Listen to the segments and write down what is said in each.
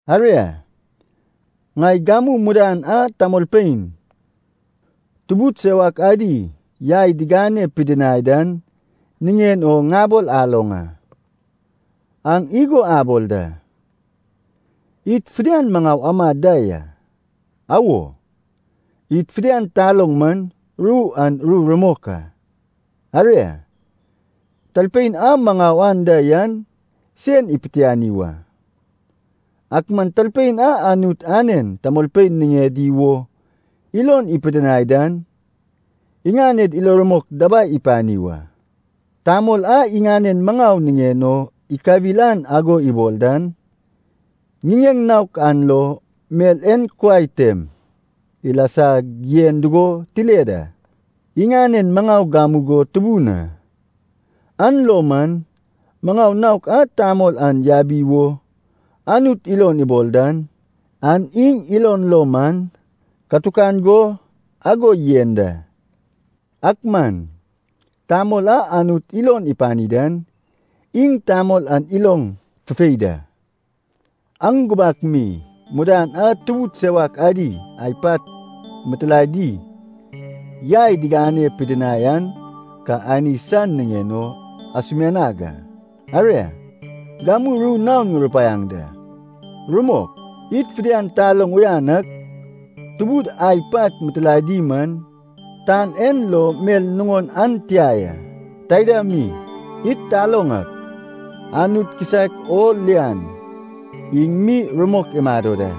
Aria, ŋai gamu mudan a tamolpein tubud sewak adi yai digane pidinai dan niŋen o ŋabol aloŋ a. Aŋ igo abol da, “Id fidian maŋau amad da ya.” Awo, id fidian taloŋ man ru an ru rumok a. Aria, talpein a maŋau anda yan sen ipitiani wa. Ak man talpein a Anut anen tamolpein niŋedi wo ilon ipidinai dan, iŋaned ilo rumok dabai ipani wa. Tamol a iŋanen maŋau niŋen o ikawil an ago ibol dan, ŋiŋeŋ naok an lo mel en kuai tem ilasag yen dugo tile da, iŋanen maŋau gamugo tubun a. An lo man maŋau naok a tamol an yabi wo Anut ilon ibol dan, an iŋ ilon lo man katukan go ago yen da. Ak man tamol a Anut ilon ipani dan, iŋ tamol an iloŋ fufei da. Aŋ gubak mi mudan a tubud sewak sad ai pat mitilaedi yai digane pidinai an ka ani san niŋen o asumianag a, aria, gamu ru naon ŋurupaiaŋ da. Rumok, id fidian taloŋ uyan ak, tubud ai pat mitilaedi man tan en lo mel nuŋon an tia ya. Taida mi id taloŋ ak, Anut kisaek o lian iŋ mi rumok imado da.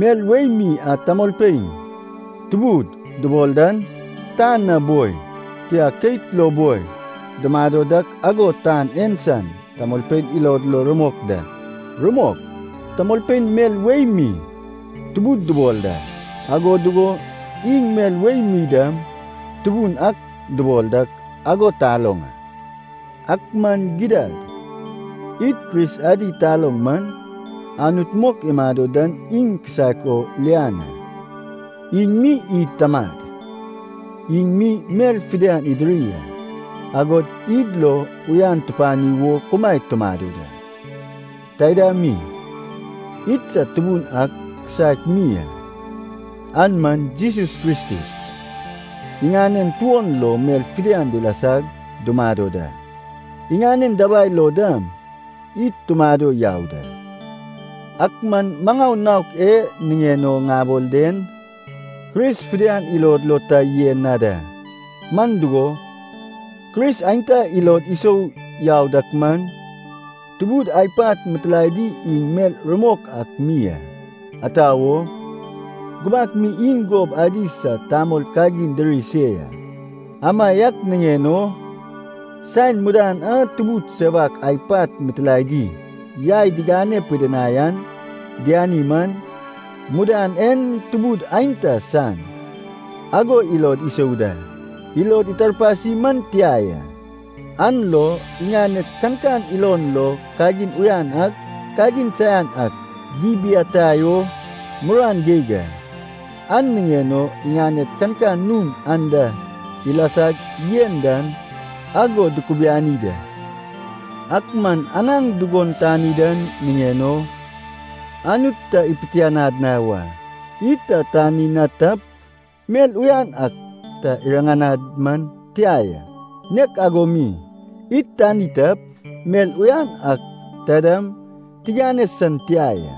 Mel wei mi a tamolpein “tubud” dubol dan, tan na boi, tia keit lo boi dumado dak ago tan en san tamolpein ilod lo rumok da. (Rumok, tamolpein mel wei mi “tubud” dubol da, ago dugo iŋ mel wei mi dam “tubun ak” dubol dak ago taloŋ a.) Ak man gidad, id Kris adi taloŋ man, Anut mok imado dan iŋ kisaek o lian a. Iŋ mi id Tamad, iŋ mi mel fidian idiri a, agod id ilo uyan tupani wo kumaed dumado da. Taida mi, idsad Tubun ak kisaek mi a, an man Jesus Kristus. Iŋanen tuon lo mel fidian dilasag dumado da, iŋanen dabai lo dam id tumado yau da. Ak man maŋau naok e niŋen o ŋabol den, Kris fidian ilod lo ta yen na da. Man dugo, Kris aenta ilod isou yau dak man, tubud ai pat mitilaedi iŋ mel rumok ak mi a, ata wo, gubak mi iŋ gob adi sad tamol kagin diri se ya. Amaiak niŋen o saen mudan a tubud sewak ai pat mitilaedi yai digane pidinai an diani man, “mudan en tubud aenta san,” ago ilod isou da. Ilod itarpasi man tia ya, an lo iŋaned kankan ilon lo kagin uyan ak, kagin saian ak dibiatai o muruan geig a, an niŋen o iŋaned kankan nun anda ilasag yen dan ago dukubiani da. Ak man anaŋ dugon tani dan niŋen o Anut ta ipitianad na wa. Id ta tani na tap, mel uyan ak ta iriŋanad man tia ya, nek ago mi, id tani tap, mel uyan ak taidam tiŋane san tia ya.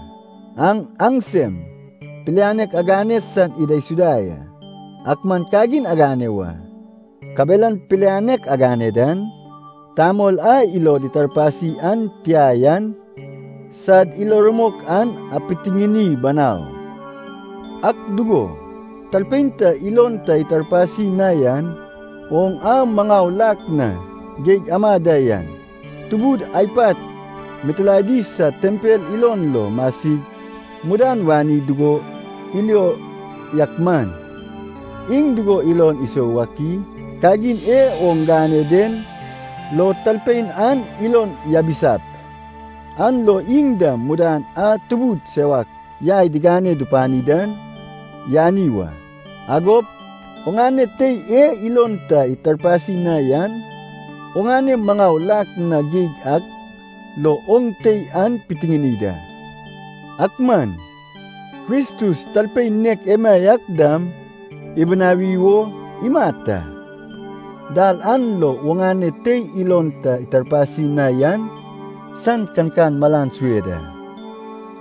Aŋ aŋsem pilianek agane san idaisuda ya, ak man kagin agane wa, kabelan pilianek agane dan, tamol a ilod itarpasi an tia yan sad ilo rumok an apitiŋini banau. Ak dugo, talpein ta ilon ta itarpasi na yan, oŋ a maŋau lak na geig ama da yan, tubud ai pat mitilaedi san tempel ilon lo masig mudan wani dugo ilio yak man, iŋ dugo ilon isou wak i? Kagin e oŋ gane den lo talpein an ilon yabisap, an lo iŋ dam mudan a tubud sewak yai digane dupani dan yani wa. Agop oŋane tei e ilon ta itarpasi na yan, oŋane maŋau lak na geig ak lo oŋ tei an pitiŋini da, ak man Kristus talpein nek emaiak dam ibinawi wo imat a. Dal an lo oŋane tei ilon ta itarpasi na yan san kankan malan sue da.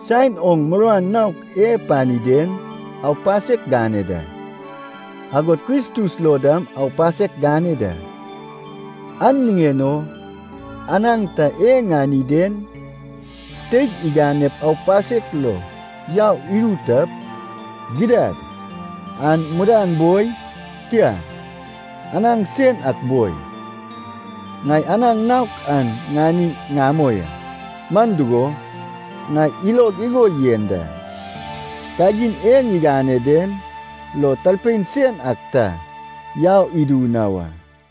Saen oŋ muruan naok e pani den, aupasek gane da, agod Kristus lo dam aupasek gane da. An niŋen o anaŋ ta e ŋani den teig iganep aupasek lo yau idu tap, gidad an mudan boi, tia, anaŋ sen ak boi, ŋai anaŋ naok an ŋani ŋamoi a. Man dugo, ŋai ilog igo yen da, kagin e ŋigane den lo talpein sen ak ta yau idu na wa.